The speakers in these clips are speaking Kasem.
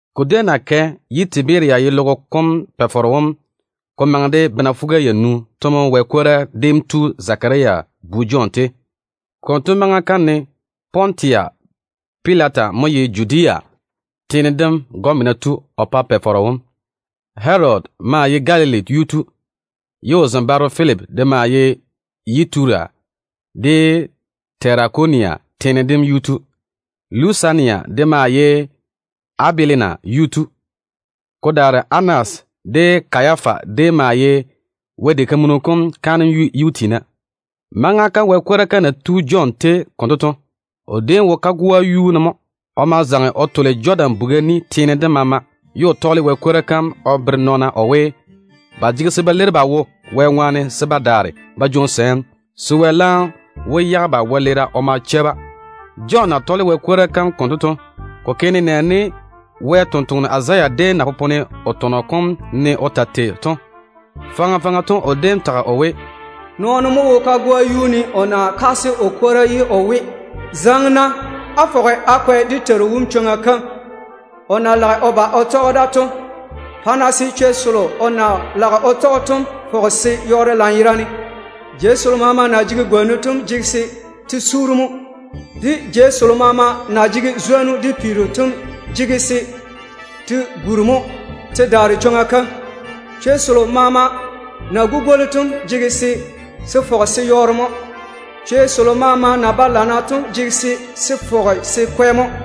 Ko déem na kɛ ye Tiberia ye logo kom Pa-faro wom ko maŋe de bena fuga-yanu to mo Wɛ kwora déem tu Zekaria bu Jɔn tei. Konto maŋa kam ne Pontusi Pilata mo ye Judea teene dem gɔmena tu o pa Pa-faro wom. Herodi maa ye Galili yuu tu, ye o zembaaro Filipi de maa ye Yituria de Terakonia teene dem yuu tu. Lusania de maa ye Abilena yuu tu. Ko daare Anas de Kayafa déem maa ye Wɛ diga kam kaanem yuu tiina. Maŋa kam Wɛ kwora kam na tu Jɔn tei konto to, o déem wo kagoa yuu ne mo. O ma zaŋe o tole Jɔdan buga ni teene dem maama, ye o tɔɔle Wɛ kwora kam o bere nɔɔna o we, ba jege se ba leiri ba wo Wɛ ŋwaane se ba daare ba jwoŋi sɛɛm, se Wɛ laam wó yage ba wɛleera o ma chɛ-ba. Jɔn na tɔɔle Wɛ kwora kam konto to, ko ke nenɛɛne Wɛ sampwora Izaya déem na popone o tɔnɔ kom ne o ta tei to. Faŋa faŋa to o déem tage o we: “Nɔɔno mo wo kagoa yuu ne o na kaase o kwora ye o we: ‘Zaŋe-na á fɔge á kwɛ dé Teiru wom chwoŋa kam o na lage o ba o tɔge da to. Pa-na se chwei selo o na lage o tɔge to fɔge se yɔɔre lanyerane. Jei selo maama na jege gwonnu to jege se te suuri mo. Jei selo maama na jege zwonnu de peero to de jege se te guri mo te daare chwoŋa kam. Chwei selo maama na gugwoli to jege se se fɔge se yɔɔre mo. Chwei selo maama na ba lana to jege se se fɔge se kwɛ mo.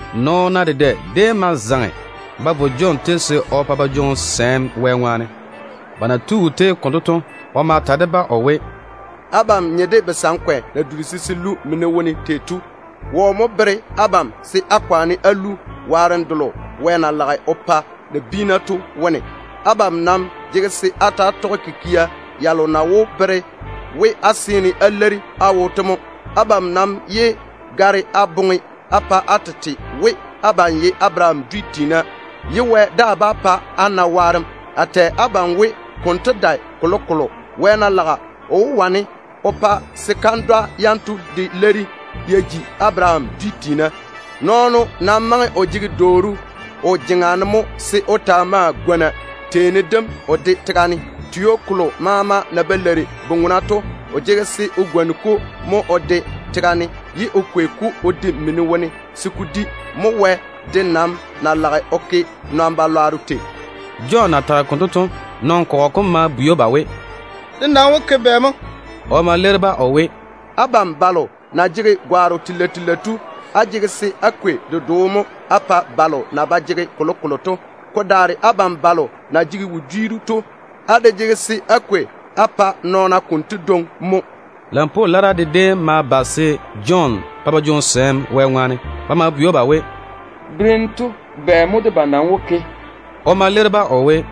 Nɔɔna dedɛ déem ma zaŋe ba vo Jɔn tei se o pa ba jwoŋi sɛɛm Wɛ ŋwaane. Ba na tu o tei konto to, o ma ta de-ba o we, “Abam nye de basankwe na dura se se lu mini wone tei to. Wɔ mo bere abam se á kwaane á lu waarem delo Wɛ na lage o pa nabiina to wone? Abam nam jege se á ta‑á tɔge kikia yalo na wó bere we á seene á leiri á wo to mo. Abam nam yé gare á boŋe á pa á tete we, abam ye Abaraham dwi tiina mo ye Wɛ daa bá pa á na waarem. A nam tɛ abam we, konto dae kolokolo. Wɛ ná laga, o wó wane o pa se kandwa yanto de leiri ya ji Abaraham dwi tiina. Nɔɔno nam maŋe o jege dwooru o jeŋa ne mo se o ma o gwoni teeni dem o de tega ne. Tio kolo maama na ba leiri bu-ŋona to, o jege se o gwoni-ko mo o de tega ne, ye o kwei-ko o de mini wone se ko di kula. Mo Wɛ de nam na lage o ke nɔn-balwaaro tei.” Jɔn na tage konto to, nɔn-kɔgɔ kom ma bwei‑o ba we, “Dé nam wó ke bɛ mo?” O ma leiri-ba o we, “Abam balo na jege gwaaro telei telei to, á jege se á kwei dedoo mo á pa balo na ba jege kolokolo to. Ko daare abam balo na jege wodiiru to, á de jege se á kwei á pa nɔɔna konto dwoŋi mo.” Lampwoo lara de déem ma ba se Jɔn pa ba jwoŋi sɛɛm Wɛ ŋwaane. Ba ma bwei‑o ba we, “Berem tu, bɛ mo debam nam wó ke?” O ma leiri-ba o we,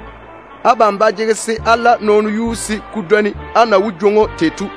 “Abam ba jege se á la nɔɔno yuu se ko dwoni á na wó jwoŋi‑o tei to.”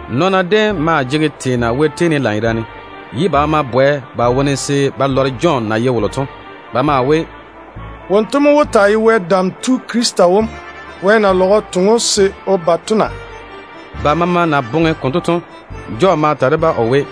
Nɔɔna déem maa jege teena Wɛ tei ne lanyerane, ye ba maama bwɛ ba wone se ba lɔre Jɔn na ye wolo to. Ba maa we, “Wonto mo wó taa ye Wɛ Dam Tu Krista wom na?” Ba maama na boŋe konto to, Jɔn ma ta de-ba o we,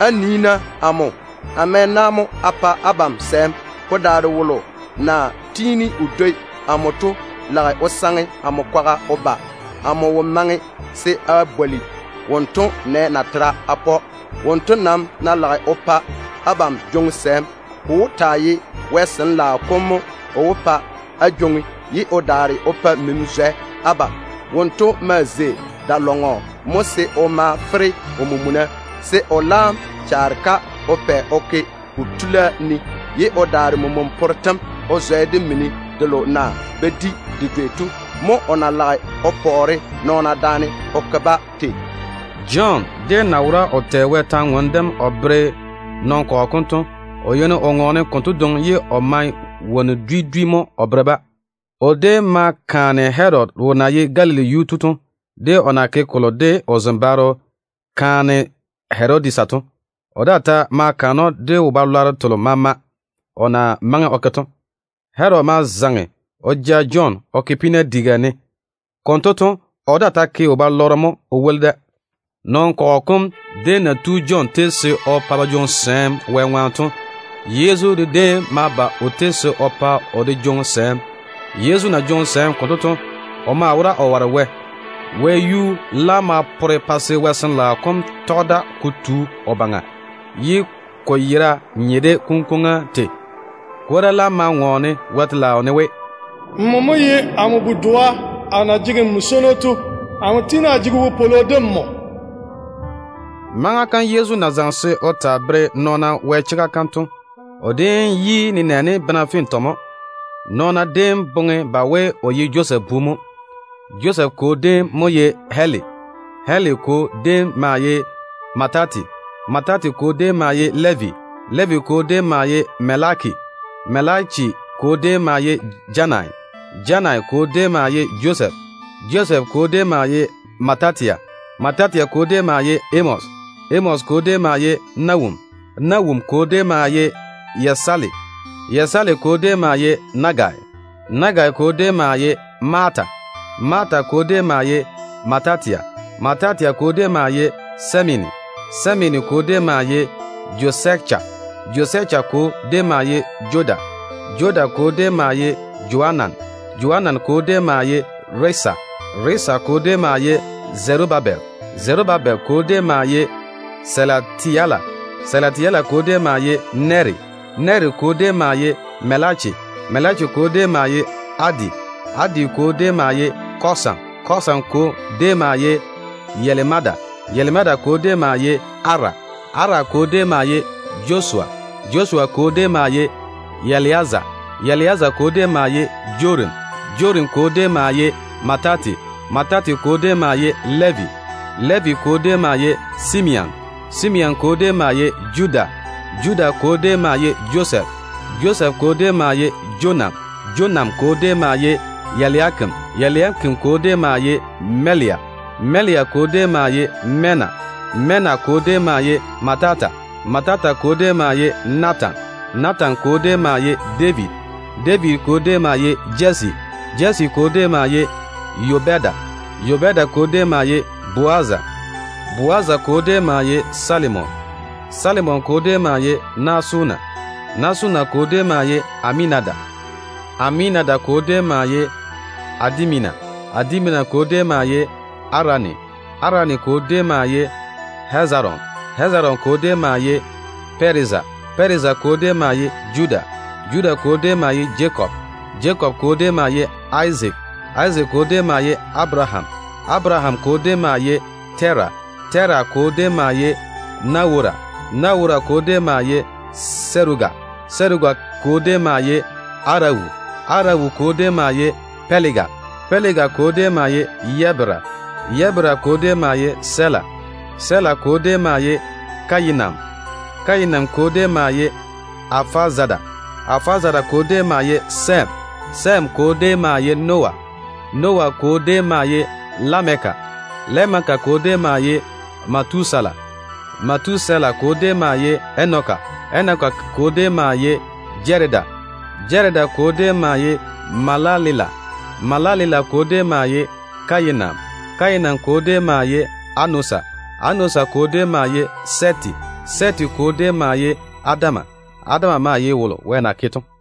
“Á nii-na amo. A mɛ na mo a pa abam sɛɛm. Ko daare wolo na tiini o dwoi amo to lage o saŋe amo kwaga o ba. Amo wo maŋe se a bwoli wonto nɛ natera a pa‑o. Wonto nam ná lage o pa abam jwoŋi sɛɛm, ko wó taa ye Wɛ Sin-laao kom mo o wó pa á jwoŋi, ye o daare o pa mini zwɛ abam. Wonto maa zei da-lɔŋɔ mo se o ma mage o mena se o laam chaare-ka o pɛ o ke o tula ne. O maa wó daare men-swanno tem o zwɛ de mini delo na ba di de dwei to. Mo o na lage o pɔɔre nɔɔna daane o ke-ba tei to.” Jɔn déem na wora o tɛ Wɛ kwor-ywoŋa kam o bere nɔn-kɔgɔ kom to, o yeini o ŋɔɔne konto dwoŋi, ye o mae wonnu dwi dwi mo o kaane-ba. O déem ma kaane Herodi wolo na ye Galili yuu tu to, de o na ke kolo de o zembaaro kaane Herodisa to. O daa ta ma kaane‑o de wo-lwanno telo maama o na maŋe o ke to. Herodi ma zaŋe o ja Jɔn o ke peena diga ne. Konto to, o daa ta ke wo-balɔrɔ mo o woli da. Nɔn-kɔgɔ kom déem na tu Jɔn tei se o pa ba jwoŋi sɛɛm Wɛ ŋwaane to, Yezu de déem ma ba o tei se o pa o de jwoŋi sɛɛm. Yezu na jwoŋi sɛɛm konto to, o maa wora o ware Wɛ. Wɛyuu laam ma pore pa se Wɛ Sin-laao kom tɔge da ko tu o baŋa, ye ko nyenyego nye de kunkwoŋa yera tei. Kwora laam ma ŋɔɔne Wɛ telaao ne we: “Nmo mo ye amo bu-doa a na jege nmo swono to. N kikia su amo yi.” Maŋa kam Yezu na bobo se o taa bere nɔɔna Wɛ chega kam to, o déem yi nenɛɛne bena fintɔ mo. Nɔɔna déem boŋe ba we o ye Josɛf bu mo. Josɛf kwo déem mo ye Heli. Heli kwo déem maa ye Matati. Matati kwo déem maa ye Levi. Levi kwo déem maa ye Melaki. Melaki kwo déem maa ye Janayi. Janayi kwo déem maa ye Josɛf. Josɛf kwo déem maa ye Matatia. Matatia kwo déem maa ye Amosi. Amosi kwo déem maa ye Nawum. Nawum kwo déem maa ye Esali. Esali kwo déem maa ye Nagayi. Nagayi kwo déem maa ye Maata. Maata kwo déem maa ye Matatia. Matatia kwo déem maa ye Semeini. Semeini kwo déem maa ye Joseka. Joseka kwo déem maa ye Joda. Joda kwo déem maa ye Joanan. Joanan kwo déem maa ye Resa. Resa kwo déem maa ye Zerubabel. Zerubabel kwo déem maa ye Selateli. Selateli kwo déem maa ye Neri. Neri kwo déem maa ye Melaki. Melaki kwo déem maa ye Adi. Adi kwo déem maa ye Kosam. Kosam kwo déem maa ye Elimadam. Elimadam kwo déem maa ye Ara. Ara kwo déem maa ye Josua. Josua kwo déem maa ye Eliazera. Eliazera kwo déem maa ye Jorim. Jorim kwo déem maa ye Matati. Matati kwo déem maa ye Levi. Levi kwo déem maa ye Simeon. Simeon kwo déem maa ye Judah. Judah kwo déem maa ye Josɛf. Josɛf kwo déem maa ye Jonam. Jonam kwo déem maa ye Eliakim. Eliakim kwo déem maa ye Melea. Melea kwo déem maa ye Menna. Menna kwo déem maa ye Matata. Matata kwo déem maa ye Natan. Natan kwo déem maa ye David. David kwo déem maa ye Jesse. Jesse kwo déem maa ye Obeda. Obeda kwo déem maa ye Bowaza. Bowaza kwo déem maa ye Salimon. Salimon kwo déem maa ye Naason. Naason kwo déem maa ye Aminadabi. Aminadabi kwo déem maa ye Adimina. Adimina kwo déem maa ye Arani. Arani kwo déem maa ye Hezeron. Hezeron kwo déem maa ye Pɛreza. Pɛreza kwo déem maa ye Judah. Judah kwo déem maa ye Jakob. Jakob kwo déem maa ye Izaak. Izaak kwo déem maa ye Abaraham. Abaraham kwo déem maa ye Tera. Tera kwo déem maa ye Rewu. Rewu kwo déem maa ye Serugi. Serugi kwo déem maa ye Arawu. Arawu kwo déem maa ye Pɛlega. Pɛlega kwo déem maa ye Ebera. Ebera kwo déem maa ye Sela. Sela kwo déem maa ye Kayinam. Kayinam kwo déem maa ye Arapazade. Arapazade kwo déem maa ye Sɛm. Sɛm kwo déem maa ye Noah. Noah kwo déem maa ye Lameke. Lameke kwo déem maa ye Metusela. Metusela kwo déem maa ye Enoki. Enoki kwo déem maa ye Jaredi. Jaredi kwo déem maa ye Mahalaleli. Mahalaleli kwo déem maa ye Kayinam. Kayinam kwo déem maa ye Enosi. Enosi kwo déem maa ye Sɛfi. Sɛfi kwo déem maa ye Adam. Adam kwo maa ye Wɛ.